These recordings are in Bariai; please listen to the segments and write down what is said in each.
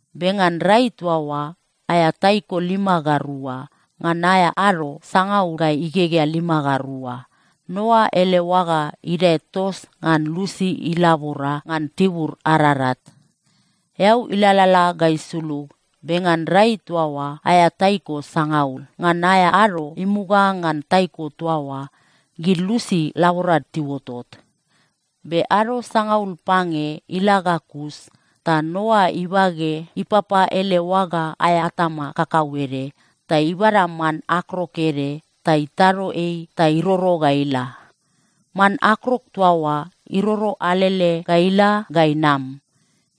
Be ngan rai toa oa aea taiko lima ga rua, ngan aea ado sangaul ga igegea lima ga rua, Noa ele oaga idae tos ngan lusi ilabora ngan tibur Ararat. Eau ilalala ga isulug, be ngan rai toa oa aea taiko sangaul, ngan aea ado imuga ngan taiko toa oa, gid lusi laborad tiuotot. Be ado sangaul pange ila ga kus ta Noa ibage ipapa ele oaga aea atama kakauede ta ibada man akrok ede ta itado ei ta iroro ga ila. Man akrok toa oa iroro alele ga ila ga inam.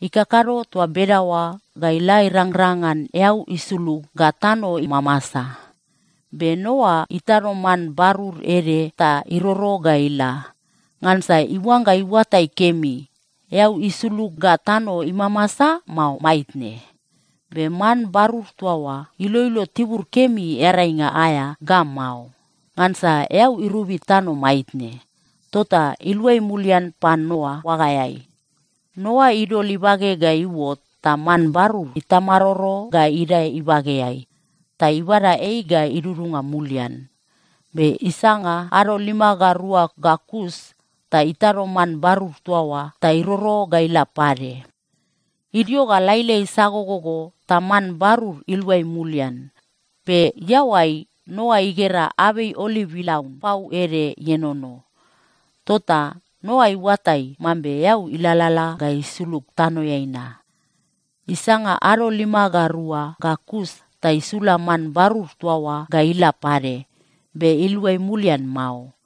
Ikakado toa bedaoa ga ila irangrang ngan eau isulug ga tano imamasa. Be Noa itado man barur ede ta iroro ga ila, ngansa iuangga iuatai kemi, eau isulug ga tano imamasa, mao maitne. Be man barur toa oa iloilo tibur kemi earainga aea ga mao. Ngansa eau irobi tano maitne. Tota iluai mulian pan Noa oagaeai. Noa idol ibage ga iuot, ta man barur itamaroro ga idae ibageai, ta ibada ei ga idudunga mulian. Be isanga ado lima ga rua ga kus ta itado man barur toa oa ta iroro ga ila pade. Idio ga lailai sagogogo ta man barur iluai mulian. Be iaoai, Noa igera abei oliv ilaun pau ede ienono. Tota Noa iuatai mambe eau ilalala ga isulug tanoeai na. Isanga ado lima ga rua ga kus ta isula man barur toa oa ga ila pade, be iluai mulian mao.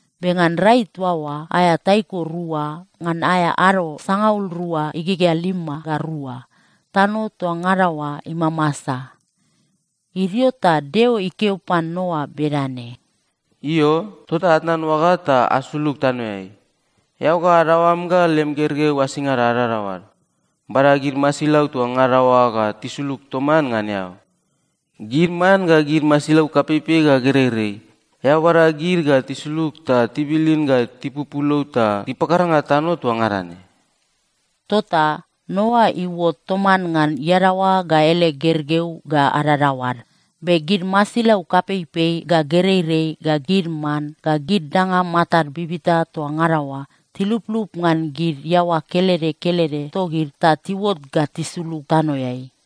Be ngan rai toa oa aea taiko rua, ngan aea ado sangaul rua igegea lima ga rua, tano toa ngada oa imamasa. Idio ta Deo ikeo pan Noa bedane, “Io, tota atnan oaga ta asulug tanoeai, eao ga adaoam ga lem gergeu asingada adadaoad. Bada gid masilau toa ngada oa ga tisulug toman ngan eao. Gid man ga gid masilau kapeipei ga gereirei, eao bada gid ga tisulug ta tibilin ga tipupulou ta tipakaranga tano toa ngada ne.” Tota Noa iuot toman ngan iadaoa ga ele gergeu ga adadaoad. Be gid masilau kapeipei ga gereirei ga gid man ga gid danga matad bibita toa ngada oa, tiluplup ngan gid iaoa kelede kelede togid ta tiuot ga tisulug tanoeai.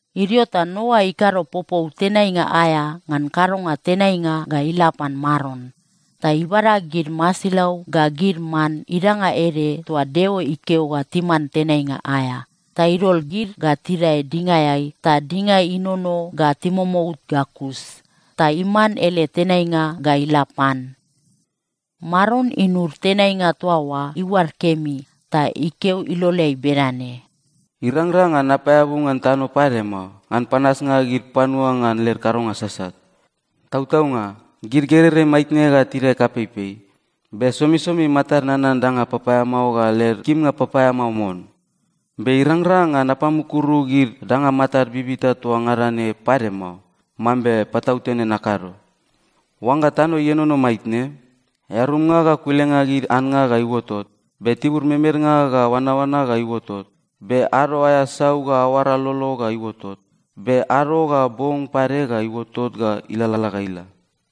Idio ta Noa ikado popou tenainga aea ngan kadonga tenainga ga ila pan Maron. Ta ibada gid masilau ga gid man idanga ede toa Deo ikeo ga timan tenainga aea, ta idol gid ga tidae dingaeai ta dinga inono ga timomout ga kus. Ta iman ele tenainga ga ila pan. Maron inud tenainga toa oa iuad kemi ta ikeo iloleai bedane, “Irangrang ngan napaeabu ngan tano pade mao, ngan panasnga gid panua ngan led kadonga sasat. Tautaunga, gid gereirei maitne ga tidae kapeipei, be somisomi matad nanan danga papaeamao ga led kimnga papaeamao mon. Be irangrang ngan napamukuru gid danga matad bibita toa ngada ne pade mao, mambe patautene nakado. “Oangga tano ienono maitne, earumnga ga kulenga gid annga ga iuotot, be tibur memednga ga oanaoana ga iuotot, be ado aea sau ga aoara lolo ga iuotot, be ado ga bong pade ga iuotot ga ilalala ga ila.”